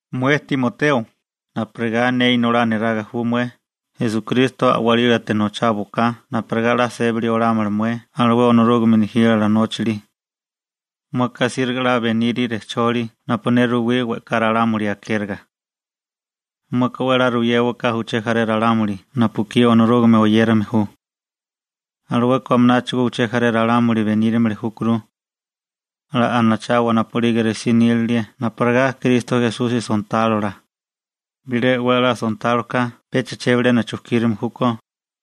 Mué Timoteo, napurigá ne inolá neraga ju mué, Esukristo a'walílate nocháwaká napurigá 'la sébali olámala mué alué Onorúgame nejílala nóchali. Mueka asíriga 'la benile rejcholi napu ne ruwí we'ká ralámuli akériga. Mueka 'we 'la ruyéwaká uché jaré ralámuli napu ekí Onorúgame oyérame ju. Alueka amináchigo uché jaré ralámuli benírimili júkuru. 'La anachawa napu'lige resí nílilie napurigá Kristo Esusi sontálola. Bilé 'we 'la sontáloka pecha chebilena chujkírame júkó,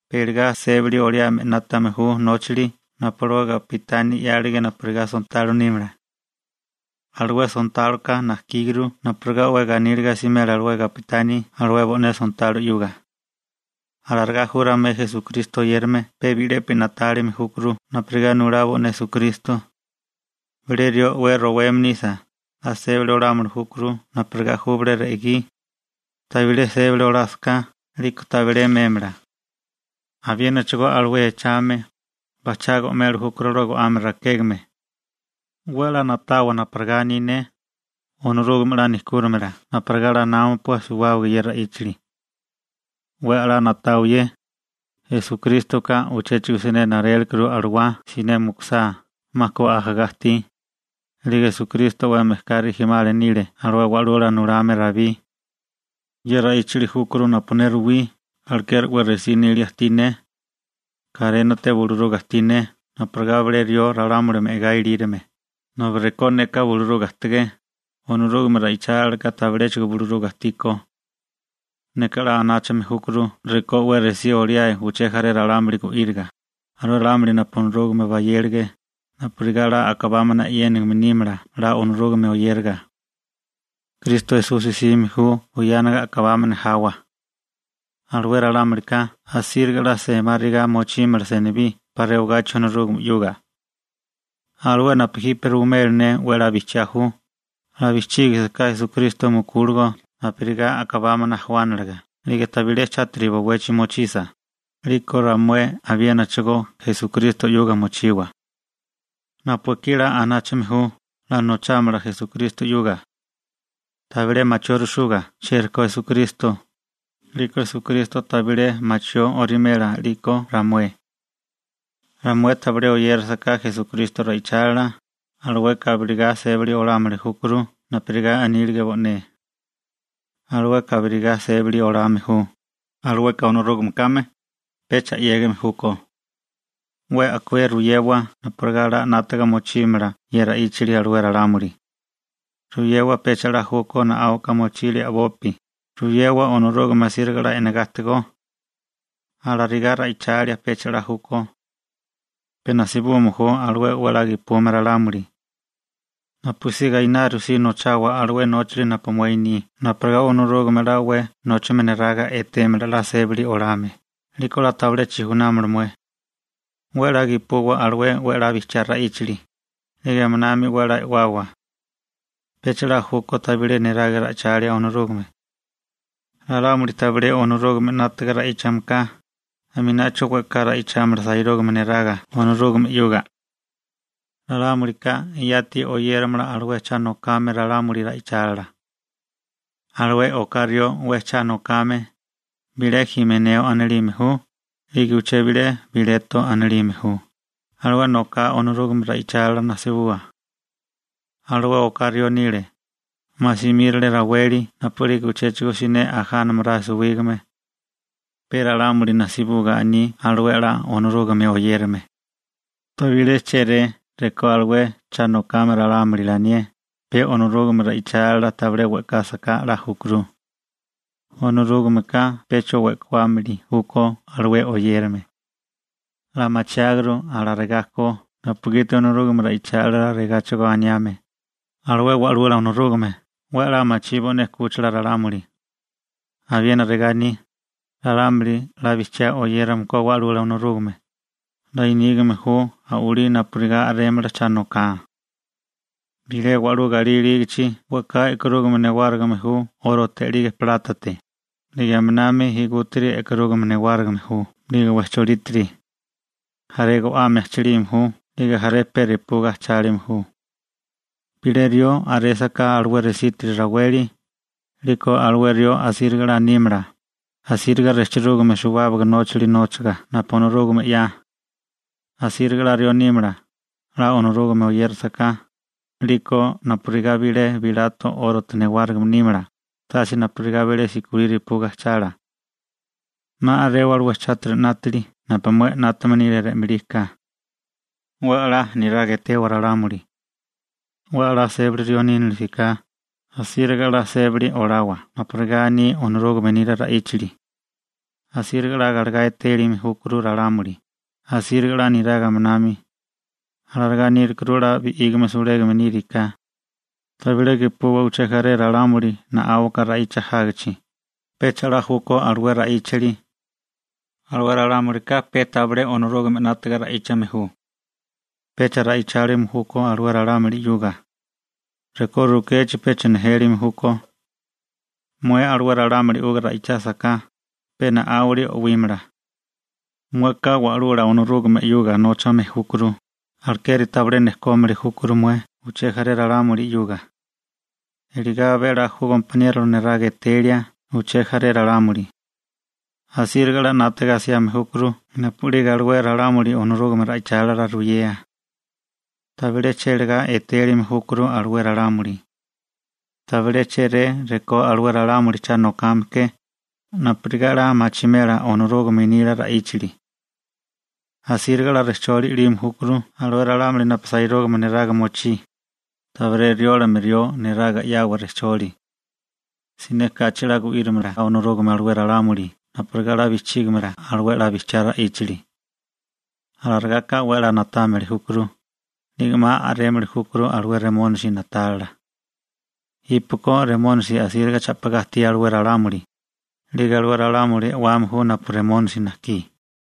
pe iligá sébali oliáme 'nátame ju nóchali napu alué gapitani 'yálige napurigá sontalo nímala. Alué sontáloka najkíguru napurigá 'we ganíliga asimela alué gapitani alué bo'né sontalo 'yuga. Alarigá ju ramué Esukristo oyérame pe bi'lepi na'tálime júkuru napurigá nulá bo'né Esukristo. Bilé rió 'we roweme nisa, 'la sébali olámili júkuru napurigá ju bilé re'gí. Tabilé sébali olásaká, 'liko tabilé mémala. Abiénachigo alué echame, bajchá go'meli júkuru alué go'ame rakégame. 'We 'la ná'tawa napurigá aní ne. Onorúgame 'la nejkúrimala napurigá 'la námapua suwábaga ye ra'íchali. 'We 'la na'tawa ye. Esukrístoka uchéchigo siné narélekuru alawá siné mukusá, 'ma ku ajagá ajtí. 'Lige Esukristo alué wa'lula nulame Rabí rijimala nile 'we 'ya ajtígame. Ye ra'íchali júkuru napu ne ruwí, alekeri 'we resí nília ajtí ne. Karénate buluruga ajtí ne napurigá bilé rió ralámuli me'gá ilírome, nobi rekó neka buluruga ajtigé, Onorúgame ra'ichálilaka tabiléchigo buluruga ajtíkó. Neka 'la anáchame júkuru rekó 'we resí oliáe uché jaré ralámuli gu'íriga, alué ralámuli napu Onorúgame bayélige, napurigá 'la a'kabámana e'yénigime nímala 'la Onorúgame oyériga. Kristo Esusi 'sime ju buyana a'kabámana jawa. Alué ralámulika asíriga 'la semáriga mochímala senibí 'pa rewagachi Onorúgame 'yuga. Alué napu jipe ruwimela ne, 'we 'la bijchiá ju: 'La bijchígisiká Esukristo mukúligo napurigá a'kabámana jawániliga 'lige tabilé chátiri bowechi mochisa, 'liko ramué abiénachigo Esukristo 'yuga mochiwa. Napu ekí 'la anáchame ju, 'la nochámala Esukristo 'yuga. Tabilé machiórisúga chiériko Esukristo, 'liko Esukristo tabilé machió orimela 'liko ramué. Ramué tabilé oyérisiká Esukristo ra'ichálila, alueka abirigá sébali olámili júkuru napurigá anílige bo'né. Alueka abirigá sébali olame ju, alueka Onorúgame kame, pecha 'yégime júkó. 'We a'kué ruyewa napurigá 'la 'nátaga mochímala ye ra'íchali alué ralámuli. Ruyewa pecha 'la júkó na'áuka mochilia a'bopi, ruyewa Onorúgame asíriga 'la e'negá ajtigó. Alarigá ra'ichalia, pecha 'la júkó. Pe najsibume ju alué 'we 'la gepume ralámuli. Napusí gainaru si nochawa alué nóchali napu mué ni napurigá Onorúgame 'la 'we nóchame neraga etémala 'la sébali olame, 'liko 'la tabilé chijunámala mué. 'We 'la gepuwa alué 'we 'la bijchiá ra'íchali, 'lige aminami 'we 'la e'wawa. Pecha 'la júkó tabilé neraga ra'ichalia Onorúgame. Ralámuli tabilé Onorúgame 'nátaga ra'íchame ka, aminacho we'ká ra'ichámala sairúgame neraga Onorúgame 'yuga. Ralámulika yati oyéramala alué cha nokame ralámuli ra'ichálila. Alué oká rió 'we cha nokame, bilé Jimeneo anilime ju, 'lige uché bilé Bileto anilime ju, alué noká Onorúgame ra'ichálila najsibua. Alué oká rió anile: «'Ma simírale raweli napu'lige uchéchigo siné ajánamaráe suwígame.» Pe ralámuli najsibuga aní alué 'la Onorúgame oyérame. Tabilé chéré rekó alué cha nokame ralámuli lanié, pe Onorúgame ra'ichálila tabilé we'kásaká 'la júkuru. Onorúgameka pecha we'kuámili júkó alué oyérame. 'La machiáguru alarigá ko napugiti Onorúgame ra'ichálila regáchigo aniame: «Alué Wa'lula Onorúgame 'we 'la machí bo'né 'kúchila ralámuli.» Abiena regá aní: «Ralámuli 'la bijchiá oyérame ko Wa'lula Onorúgame, 'la nígame ju a'walí napurigá a'rémala cha noká.» Bilé wa'lú galí ilígichi we'ká e'karúgame newárigime ju 'órote 'lige plátate, 'lige aminami igútiri e'karúgame newárigime ju 'lige wejcholítiri. Jaré go'ame ajchilime ju 'lige jaré pe repuga ajchálime ju. Bilé rió a'résaká alué resítiri raweli, 'liko alué rió asíriga a'lá nímala, asíriga rejchirúgame suwábaga nóchali nóchaga napu Onorúgame 'ya. Asíriga 'la rió nímala, 'la Onorúgame oyérasaká, 'liko napurigá bilé bilato 'órote newárigime nímala, tase napurigá bilé sikolí repuga ajchala. 'Ma a'rewa alué chátiri 'nátili napu mué 'nátame nile re'malí ka. 'We 'la niraga etewa ralámuli. 'We 'la sébali rió nínilisiká, asíriga 'la sébali olawa napurigá aní Onorúgame nila ra'íchali. Asíriga 'la galegá etélime júkuru ralámuli, asíriga 'la niraga aminami. Alarigá nírukuru 'la bi'ígame sulégame níriká. Tabilé gepuwa uché jaré ralámuli na'áuka ra'icha jágichi, pecha 'la júkó alué ra'íchali. Alué ralámulika pe tabilé Onorúgame 'nátiga ra'íchame ju. Pecha ra'ichálime júkó alué ralámuli 'yuga. Rekó rukechi pecha nejélime júkó. Mué alué ralámuli 'yuga ra'ichásaká, pe na'áwili o'wímala. Mueka Wa'lula Onorúgame 'yuga nóchame júkuru, alekeri tabilé nejkómili júkuru mué uché jaré ralámuli 'yuga. Eligá abé 'la ju gompaniérola niraga etelia uché jaré ralámuli. Asíriga 'la 'nátaga asiame júkuru napu'lige alué ralámuli Onorúgame ra'ichálila ruyea. Tabilé chélegá etélime júkuru alué ralámuli. Tabilé chéré rekó alué ralámuli cha nokame ke, napurigá 'la machimela Onorúgame nila ra'íchali. Asíriga 'la rejcholi i'lime júkuru alué ralámuli napu sairúgame neraga mochí, tabilé riólame rió neraga 'yawa rejcholi. Siné kachi 'la gu'írimala Onorúgame alué ralámuli napurigá 'la bijchígimala alué 'la bijchiá ra'íchali. Alarigáká 'we 'la na'támili júkuru, 'lige 'ma a'rémili júkuru alué Remónisi na'tálila. Jípeko Remónisi asíriga cha'pigá ajtí alué ralámuli, 'lige alué ralámuli e'wame ju napu Remónisi najkí.